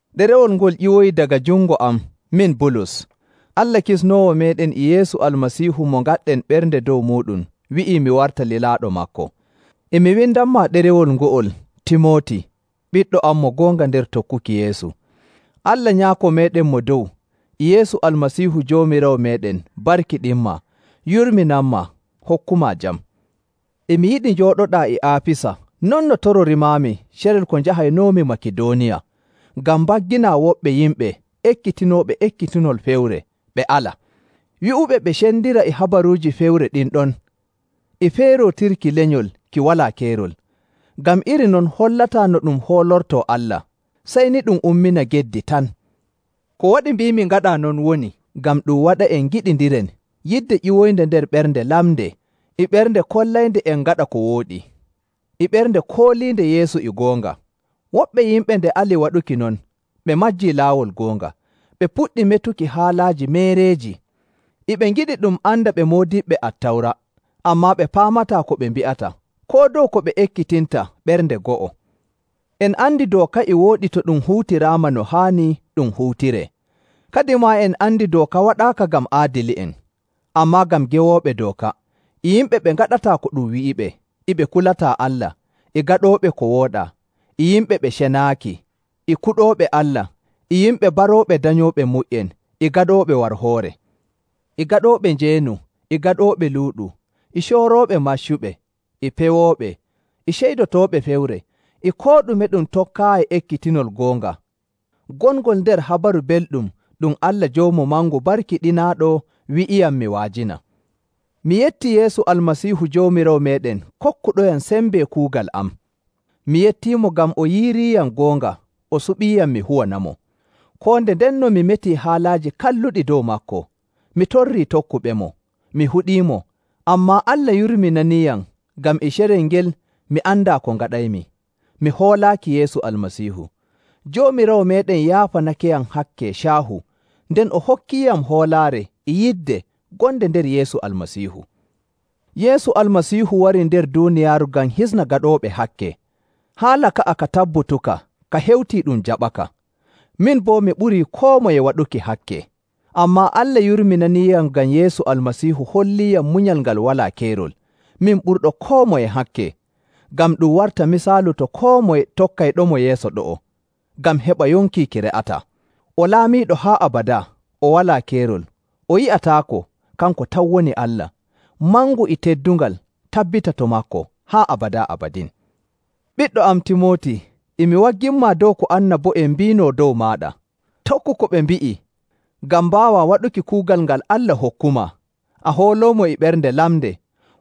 Ɗerewol ngo'ol ƴiwoyii daga jungo am, min Bulus. Allah Kisnoowo meeɗen e Yeesu Almasiihu mo ngaɗɗen ɓernde dow muuɗum wi'ii mi warta lilaaɗo maako. E mi windanmaa ɗerewol ngo'ol, Timooti, ɓiɗɗo am mo goonga nder tokkuki Yeesu. Allah Nyaako meeɗen Mo Dow e Yeesu Almasiihu Joomiraawo meeɗen barkiɗinmaa, yurminanmaa, hokkumaa jam. E mi yiɗi njooɗoɗaa e Aafisa, non no tororimaami carel ko njahaynoomi Makidooniya, ngam mbagginaa woɓɓe yimɓe ekkitinooɓe ekkitinol fewre ɓe ala. Wi'uɓe ɓe cendira e habaruuji fewre ɗin ɗon e feerootirki lenyol ki walaa keerol, ngam iri non hollataa no ɗum hoolortoo Allah, sey ni ɗum ummina geddi tan. Ko waɗi mbiimi ngaɗaa non woni ngam ɗum waɗa'en ngiɗindiren yidde ƴiwoynde nder ɓernde lamnde e ɓernde kollaynde en ngaɗa ko wooɗi, e ɓernde kooliinde Yeesu e goonga. Woɓɓe yimɓe nde ali waɗuki non, ɓe majjii laawol goonga, ɓe puɗɗi metuki haalaaji meereeji. E ɓe ngiɗi ɗum anda ɓe moodiɓɓe Attawra, ammaa ɓe paamataa ko ɓe mbi'ata, koo dow ko ɓe ekkitinta ɓernde go'o. En andi dooka e wooɗi to ɗum huutiraama no haani ɗum huutiree. Kadimaa en andi dooka waɗaaka ngam aadili'en, ammaa ngam gewooɓe dooka, e yimɓe ɓe ngaɗataa ko ɗum wi'iɓe, e ɓe kulataa Allah, e gaɗooɓe ko wooɗaa, e yimɓe ɓe cenaaki, e kuɗooɓe Allah, e yimɓe barooɓe danyooɓe mu''en, e gaɗooɓe warhoore, e gaɗooɓe njeenu, e gaɗooɓe luuɗu, e coorooɓe maccuɓe, e pewooɓe, e ceydotooɓe fewre, e koo ɗume ɗum tokkaayi ekkitinol goonga, gongol nder Habaru Belɗum ɗum Allah joomu mangu barkiɗinaaɗo wi'iyam mi wa'ajina. Mi yettii Yeesu Almasiihu Joomiraawo meeɗen kokkuɗoyam sembe kuugal am. Mi yettiimo ngam o yiiriiyam goonga o suɓiiyam mi huwanamo. Koo nde ndenno mi metii haalaaji kalluɗi dow maako, mi torrii tokkuɓemo, mi huɗiimo, ammaa Allah yurminaniiyam, ngam e carel ngel, mi andaa ko ngaɗaymi, mi hoolaaki Yeesu Almasiihu. Joomiraawo meeɗen yaafanakeyam hakke caahu, nden o hokkiiyam hoolaare e yidde gonde nder Yeesu Almasiihu. Yeesu Almasiihu warii nder duuniyaaru ngam hisna gaɗooɓe hakke. Haala ka'a ka tabbutuka ka hewtii ɗum jaɓaka. Min boo, mi ɓurii koo moye waɗuki hakke. Ammaa Allah yurminaniiyam ngam Yeesu Almasiihu holliiyam munyal ngal walaa keerol, min ɓurɗo koo moye hakke, ngam ɗum warta misaalu to koo moye tokkayɗomo yeeso ɗo'o ngam heɓa yonki ki re'ataa. O Laamiiɗo haa abadaa, o walaa keerol, o yi'ataako, kanko tan woni Allah. Mangu e teddungal tabbita to maako haa abadaa abadin. Ɓiɗɗo am, Timooti, e mi wagginmaa dow ko annabo'en mbiinoo dow maaɗa. Tokku ko ɓe mbi'i ngam mbaawaa waɗuki kuugal ngal Allah hokkumaa, a hooloomo e ɓernde lamnde.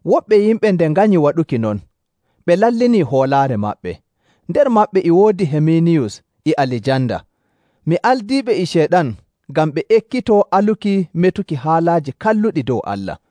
Woɓɓe yimɓe nde nganyi waɗuki non, ɓe lallinii hoolaare maɓɓe. Nder maɓɓe e woodi Himeeniyus e Alijanda. Mi aldiiɓe e Ceyɗan ngam ɓe ekkitoo aluki metuki haalaaji kalluɗi dow Allah.